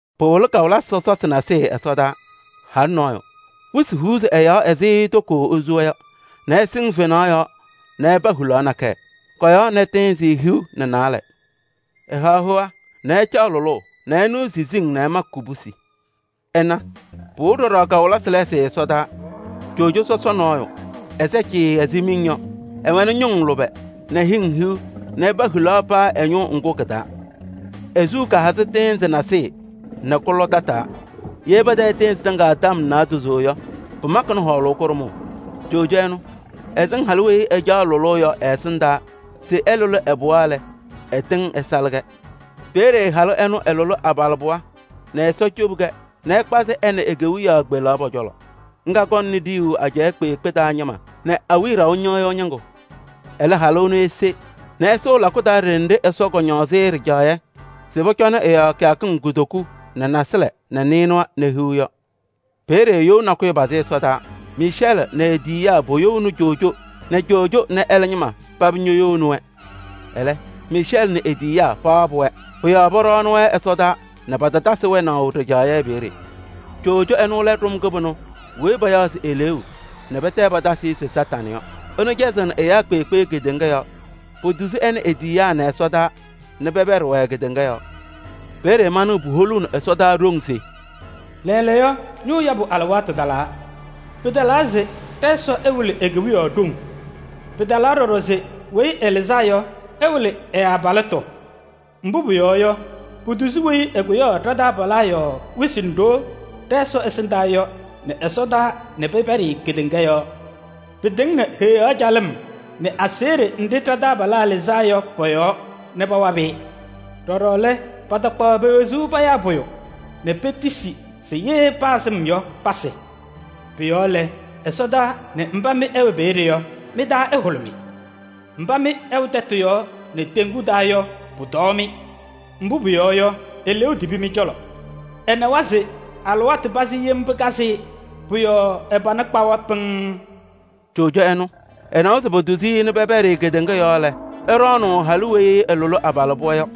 Pɩwɩlɩ kawɩlɩsɩ sɔsɔsɩ nasɩyɩ ɛsɔdaa: halʋ nɔɔyʋ, esu wɩsɩ nɛ ɛsɩŋ fenaɣ yɔɔ nɛ ɛpa hulaɣ nakɛyɛ. Kɔ-yɔɔ nɛ tɩɩnzɩ hiu nɛ naalɛ. Ɛhaɣ hoa nɛ ɛcaɣ lʋlʋʋ nɛ ɛnɩɣ siziŋ nɛ ɛmakɩ kubusi. Ɩna! Pɩwɩlɩ ɖɔɖɔ kawɩlɩsɩ lɛɛsɩ ɛsɔdaa: coojo sɔsɔ nɔɔyʋ, ɛsɛ cɩɩɩ ɛzɩ miŋ yɔ. Ɛwɛnɩ ñʋŋ lʋbɛ nɛ hɩŋ hiu nɛ ɛpa hulaɣ paa ɛ-ñʋʋ ŋgʋ kɩ-taa. E-suu kahazɩ tɩɩnzɩ nasɩyɩ nɛ kʋlɔ tataa. Ye patayɩ tɩɩnzɩ tɩŋa tɔm naadozo yɔ, pɩmakɩnɩ hɔɔlʋʋ kʋɖʋmʋʋ. Coojo ɛnʋ, ɛsɩŋ halʋ weyi ɛcaɣ lʋlʋʋ yɔ ɛ-ɛsɩndaa se ɛlʋlɩ ɛ-pɩɣa lɛ, ɛtɩŋ ɛsalɩ-kɛ. Peeye halʋ ɛnʋ ɛlʋlɩ abalɩbɩɣa nɛ Ɛsɔ cobi-kɛ nɛ ɛkpazɩ ɛ nɛ e-kewiyaɣ kpelaɣ pɔ-cɔlɔ. Ŋga kɔŋnɩ ɖiyuu ajɛɛ kpeekpe taa ñɩma nɛ awiya ɖaʋ ñɩɣyʋʋ ñɩŋgʋ. Ɛlɛ halʋ ɛnʋ ese nɛ ɛsʋʋ lakʋ taa ɖenɖe Ɛsɔ kɔñɔɔzɩ-ɩ ɖɩjaɣyɛ se pɔcɔnɩ ɛ-yɔɔ kɩyakɩŋ kutoku nɛ nasɩlɛ nɛ nɩɩnʋwa nɛ hiu yɔ. Peeye you nakʋyʋ pazɩ ɛsɔdaa. Miicɛɛlɩ nɛ e-tiyiyaa poyouni coojo nɛ coojo nɛ ɛlɛ ñɩma paba ñoyouni-wɛ. Ɛlɛ, Miicɛɛlɩ nɛ e-tiyiyaa pawabɩ-wɛ. Pʋ-yɔɔ pɔɖɔnɩ-wɛ ɛsɔdaa nɛ patatasɩ wɛnaʋ ɖɩjaɣyɛ peeye. Coojo sɔsɔ ɛnʋ lɛ ɖʋm kɩbɩnʋ weyi payaɣ se Eleeu nɛ pɛtɛ patasɩ-ɩ se Kañadʋ Satanɩ yɔ. Ɛnʋ cɛzɩɣnɩ ɛyaa kpeekpe kedeŋa yɔɔ. Potuzi ɛ nɛ e-tiyiyaa nɛ ɛsɔdaa nɛ pɛpɛɖɩ-wɛ kedeŋa yɔɔ. Peeye manɩɣ puholuuni ɛsɔdaa ɖoŋ se: “Lɛɛlɛɛyɔ, ñʋʋ yabʋ alɩwaatʋ talaa! Pɩtalaa se ɖɛ-Ɛsɔ ɛwɩlɩ e-Kewiyaɣ ɖoŋ! Pɩtalaa ɖɔɖɔ se Weyi Ɛlɩzaa Yɔ, ɛwɩlɩ ɛ-abalɩtʋ. Mbʋ pʋyɔɔ yɔ, potuzi weyi ɛkʋyaɣ ɖa-taabalaa yɔɔ wɩsɩ nɛ ɖoo ɖɛ-Ɛsɔ ɛsɩndaa yɔ nɛ ɛsɔdaa nɛ pɛpɛɖɩ-ɩ kedeŋa yɔɔ. Pɩtɩŋnɩ Heɣa calɩm nɛ aseɣɖe nɖɩ ɖa-taabalaa lɩzaa yɔ pɔ-yɔɔ nɛ pawabɩ-ɩ. Ɖɔɖɔ lɛ, patakpaɣ pe-wezuu payaa pʋyʋ nɛ petisi se ye paa sɩm yɔ, pasɩ. Pʋ-yɔɔ lɛ, ɛsɔdaa nɛ mba mɩ ɩwɛ peeye yɔ, mɩ-taa ɛhʋlʋmɩ! Mba mɩ ɩwɛ tɛtʋ yɔɔ nɛ teŋgu taa yɔ, pʋtɔɔ-mɩ! Mbʋ pʋyɔɔ yɔ, eleeu tibi mɩ-cɔlɔ. Ɛnawa se alɩwaatʋ pazɩ yem pɩkazɩ-ɩ, pʋ-yɔɔ ɛ-pana kpawa pɩŋŋ.” Coojo ɛnʋ, ɛnawa se potuzi-i nɛ pɛpɛɖɩ kedeŋa yɔɔ lɛ, ɛɖɔɔnʋʋ halʋ weyi ɛlʋlɩ abalɩbɩɣa yɔ.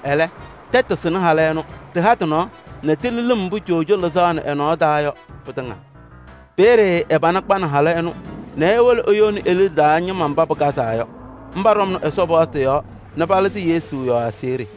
Ɛlɛ, tɛtʋ sɩnɩ halʋ ɛnʋ: tɩha tɩ-nɔɔ nɛ tili lɩm mbʋ coojo lɩzaɣnɩ ɛ-nɔɔ taa yɔ, pɩtɩŋa. Peeye ɛ-pana kpanɩ halʋ ɛnʋ nɛ ewolo eyouni e-liɖe taa ñɩma mba pakazaa yɔ. Mba ɖɔmnɩ Ɛsɔ paɣtʋ yɔɔ nɛ palɩzɩ Yesu yɔɔ aseɣɖe.